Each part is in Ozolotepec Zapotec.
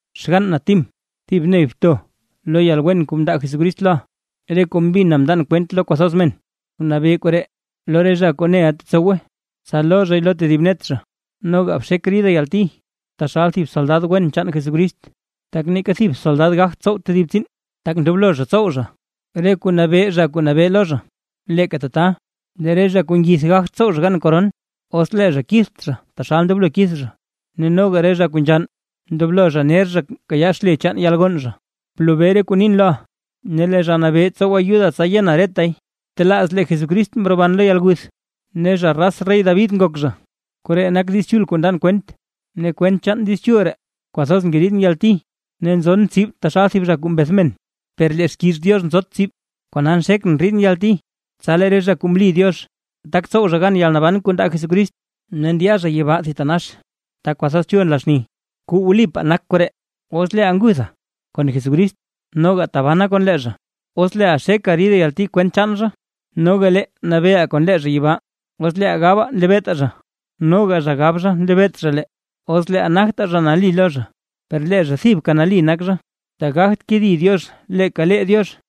Xgann na Tim, thib ney bto lo yalwen kuu mndaa Jesucrist loʼaa. Re kuu mbina mndan kwent lo kwathoz men, bnabee koree lo re zha kuu neʼa tetsowe, tsa loo zhay lo tedib net zha. Noga bxek rida yalti taxal thib soldad wen chaan Jesucrist. Tak neeka thib soldad gagt tsow tedib tsiin, tak ndoblo zha tsow zha re kuu nabee zha kuu nabee lo zha. Leeka tata, lee re zha kuu ngith gagt tsow zha gan koron, os lee zha kitht zha taxal ndoblo kith zha. Ne noga re zha kuu nzhann, ndoblo zha ner zha kayaa xle chaan yalgonn zha. Blobee re kuu nin loʼa, ne lee Zha Nabee tsow ayuda tsa yena retay. Btelaaz lee Jesucrist mroban lo yalguth, ne zha raz rey David nak zha. Koree nak Diiz Chul kuu ndan kwent. Ne kwent chaan Diiz Chul ree kwathoz ngeriidʼn yalti, ne nzon tsib taxal thib zha kuu mbeth men; per lee xkiiz Diox nzot tsib. Kona nxekʼn ndriidʼn yalti, tsa lee re zha kuu mli Diox, tak tsow zha gan yalnaban kuu ndaa Jesucrist, ne ndya zha yibaa thitanax ta kwathoz chul nla xni. Kuu wlipaa nak koree: Os leeʼaa nguthaa kon Jesucrist, noga tabanaa kon lee zha; os leeʼaa xekaa ridaa yalti kwent chaan zha, noga lee nabeeʼaa kon lee zha yibaa. Os leeʼaa gabaa nlebeetaa zha, noga zha gab zha nlebeet zha lee. Os leeʼaa nagtaa zha nali lo zha, per lee zha thibka nali nak zha, tak gagt kedi Diox leeka lee Diox.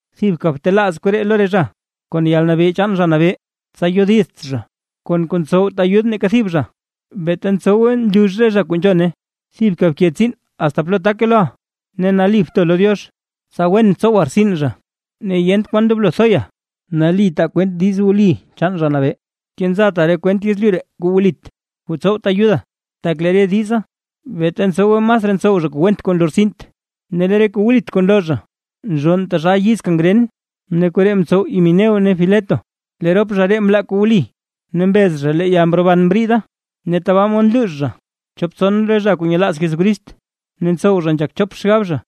Thibka btelaaz koree lo re zha, kon yalnabee chaan Zha Nabee, tsa yodizt zha, kon kuu ntsowt ayud neeka thib zha, beeta ntsowe nlux re zha kuu nzhone. Thibka bke tsiin asta plo take loʼa, ne nali bto lo Diox; tsa wen tsowa rtsin zha, ne yent kwan ndoblo thoya. Nali taa kwent diiz wli chaan Zha Nabee. Kenzata re kwent yezlyu ree re kuu wlit, kuu tsowt ayuda. Tak lee re diza, beeta ntsowe masraa ntsow zha kuu went kuu nlortsint. Ne lee re kuu wlit kuu nloo zha nzhonn taxal yiz kangren. Ne koree mtsow Himeneo ne Fileto. Lee rop zha ree mlaa kuu wli, ne mbez zha lee yalroban mriida, ne tabaa mod nluux zha chop tson re zha kuu nyelaaz Jesucrist ne ntsow zha nzhak chop xgab zha.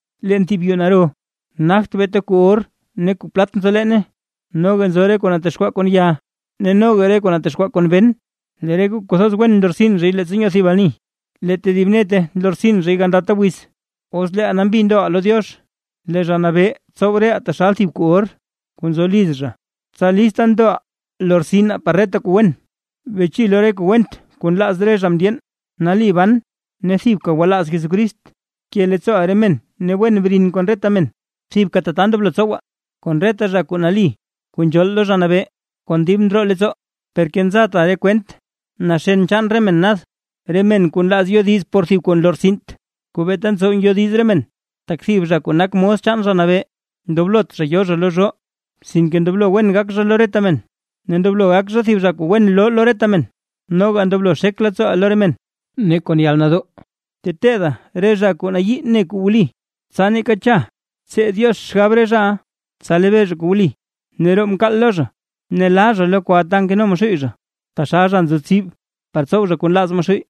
Leen thib yuu naro, nagt beeta kuu or ne kuu plat nzo leene, noga nzo re kuu natexkwaa kon ya ne noga re kuu natexkwaa kon ben. Lee re kuu kwathoz wen nlortsin zhay leettsa nyoo thib ani, lee tedib nete nlortsin zha gandata wiz. Os leeʼaa nambi ndoʼa lo Diox, lee Zha Nabee tsow reʼaa taxal thib kuu or kuu nzo liz zha, tsa lista ndoʼaa lortsinaa par reta kuu wen. Beche lo re kuu went kuu nlaaz re zha mndyeen, nali ban ne thibka gwalaaz Jesucrist, bke leettsooʼa re men ne wen brin kon reta men; thibka tata ndoblo tsowa, kon reta zha kuu nali kuu nzhool lo Zha Nabee kon dib ndroo leettsoo. Per kenzata re kwent naxen chaan re men nad, re men kuu nlaaz yodiz por thib kuu nlortsint, kuu beeta ntsow ngyodiz re men. Tak thib zha kuu nak mos chaan Zha Nabee ndoblot zha yo zha lo zhoo, sinke ndoblo wen gak zha lo reta men, ne ndoblo gak zha thib zha wen loo lo re men, noga ndoblo xek leettsoo zha lo re men. Ne kon yalnadoo teteeda zha re zha kuu nayii ne kuu wli, tsa neeka cha tsee Diox xgab re zhaʼa, tsa lebee zha kuu wli, ne roo mkaal lo zha ne laa zha lo kwa ta nkeno Maxuuy zha taxal zha nzo tsib, par tsow zha kuu nlaaz Maxuuy.